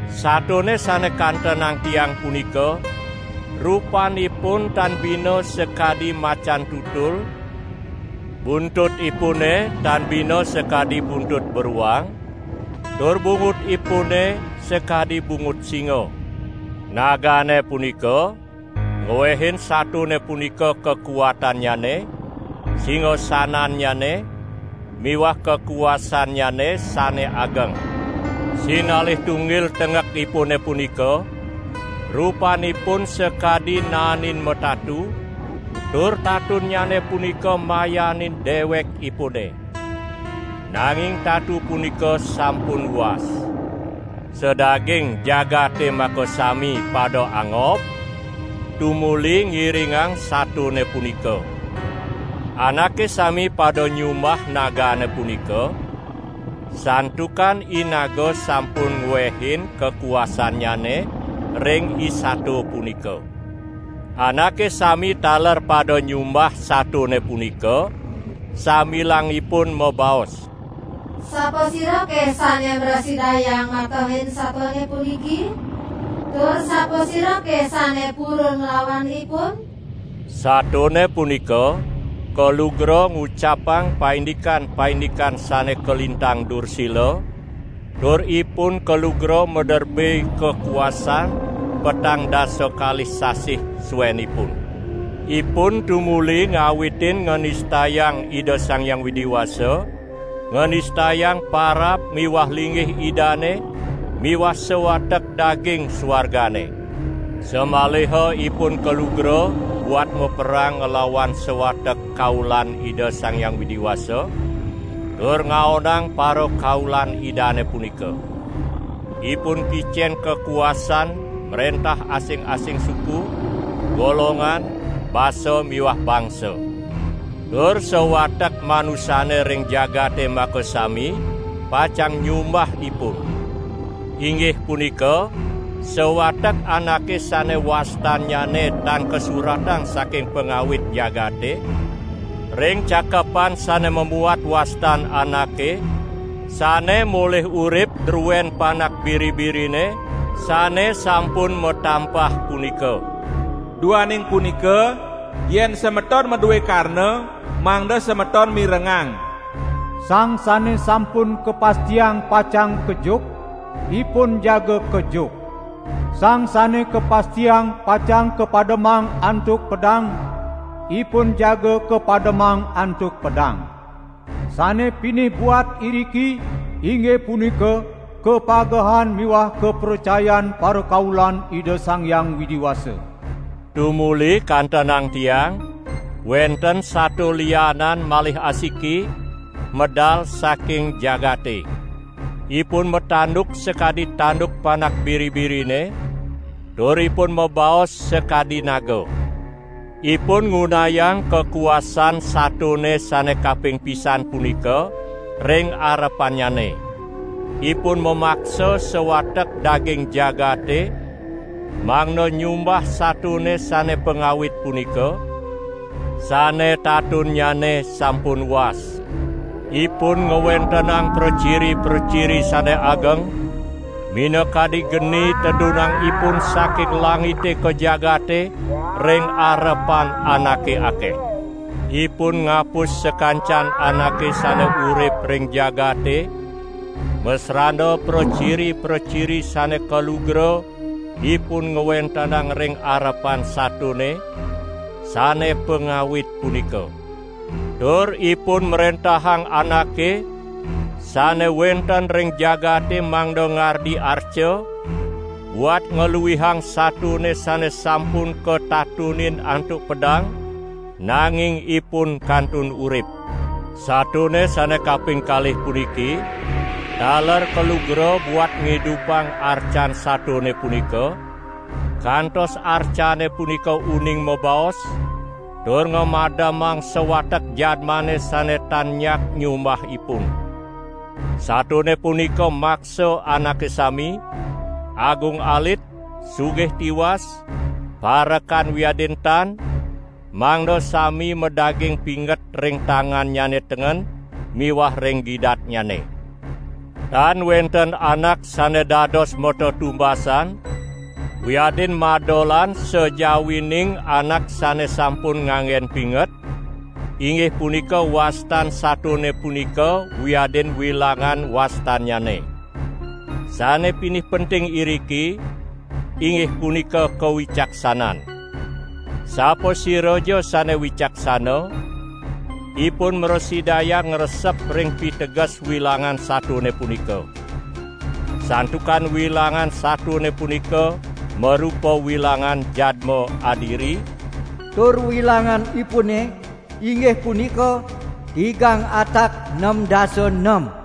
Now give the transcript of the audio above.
Satone sane kantenang tiang punika rupanipun tan bina sakadi macan tutul, buntutipune tan bina sakadi buntut beruang, tur bungutipune sakadi bungut singa. Nagane punika ngwehin satone punika kakuatannyane, singasanannyane miwah kakuasannyane sane ageng. Sinalih tunggil tenggekipune punika, rupanipun sakadi naenin matatu, tur tatunnyane punika mayanin dewekipune. Nanging tatu punika sampun was. Sadaging jagate makasami pada angob, tumuli ngiringang satone punika. Anake sami pada nyumbah nagane punika, santukan inaga sampun ngwehin kakuasannyane ring isato punika. Anake sami taler pada nyumbah satone punika sambilang ipun mabaos: "Sapasirake sane mrasidayang matehin satone puniki? Tur sapasirake sane purun nglawan ipun?" Satone punika kalugra ngucapang paindikan-paindikan sane kalintang dursila, tur ipun kalugra maderbe kakuasan petang dasa kalih sasih suenipun. Ipun tumuli ngawitin nganistayang Ida Sang Hyang Widi Wasa, nganistayang parab miwah linggih Idane miwah sawatek daging suargane. Samaliha ipun kalugra buat maperang nglawan sawatek kaulan Ida Sang Hyang Widi Wasa, tur ngaonang parakaulan Idane punika. Ipun kicen kakuasan mrentah asing-asing suku, golongan, basa miwah bangsa. Tur sawatek manusane ring jagate makasami pacang nyumbah ipun. Inggih punika sawatek anake sane wastannyane tan kasuratang saking pangawit jagate, ring cakepan sane mamuat wastan anake sane molih urip druen Panak Biri-birine sane sampun matampah punika. Duaning punika, yen semeton madue karna, mangda semeton mirengang. Sang sane sampun kapastiang pacang kejuk, ipun jaga kejuk; sang sane kapastiang pacang kapademang antuk pedang, ipun jaga kapademang antuk pedang. Sane pinih buat iriki inggih punika kapagehan miwah kapracayan parakaulan Ida Sang Hyang Widi Wasa. Tumuli kantenang tiang wenten sato lianan malih asiki medal saking jagate. Ipun matanduk sakadi tanduk Panak Biri-birine, tur ipun mabaos sakadi naga. Ipun ngunayang kakuasan satone sane kaping pisan punika ring arepannyane. Ipun mamaksa sawatek daging jagate mangda nyumbah satone sane pangawit punika, sane tatunnyane sampun was. Ipun ngwentenang praciri-praciri sane ageng, minakadi geni tedunang ipun saking langite ka jagate ring arepan anake akeh. Ipun ngapus sakancan anake sane urip ring jagate masrana praciri-praciri sane kalugra ipun ngwentenang ring arepan satone sane pangawit punika. Tur ipun mrentahang anake sane wenten ring jagate mangda ngardi arca buat ngluihang satone sane sampun katatunin antuk pedang, nanging ipun kantun urip. Satone sane kaping kalih puniki taler kalugra buat ngidupang arcan satone punika kantos arcane punika uning mabaos, tur ngamademang sawatek jadmane sane tan nyak nyumbah ipun. Satone punika maksa anake sami, agung alit, sugih tiwas, parekan wiadin tan, mangda sami madaging pinget ring tangannyane tengen miwah ring gidatnyane. Tan wenten anak sane dados matetumbasan wiadin madolan sajawining anak sane sampun nganggen pinget, inggih punika wastan satone punika wiadin wilangan wastannyane. Sane pinih penting iriki, inggih punika kawicaksanan. Sapasiraja sane wicaksana, ipun mrasidayang ngresep ring piteges wilangan satone punika. Santukan wilangan satone punika marupa wilangan jadma adiri, tur wilanganipune inggih punika tigang atak nem dasa nem.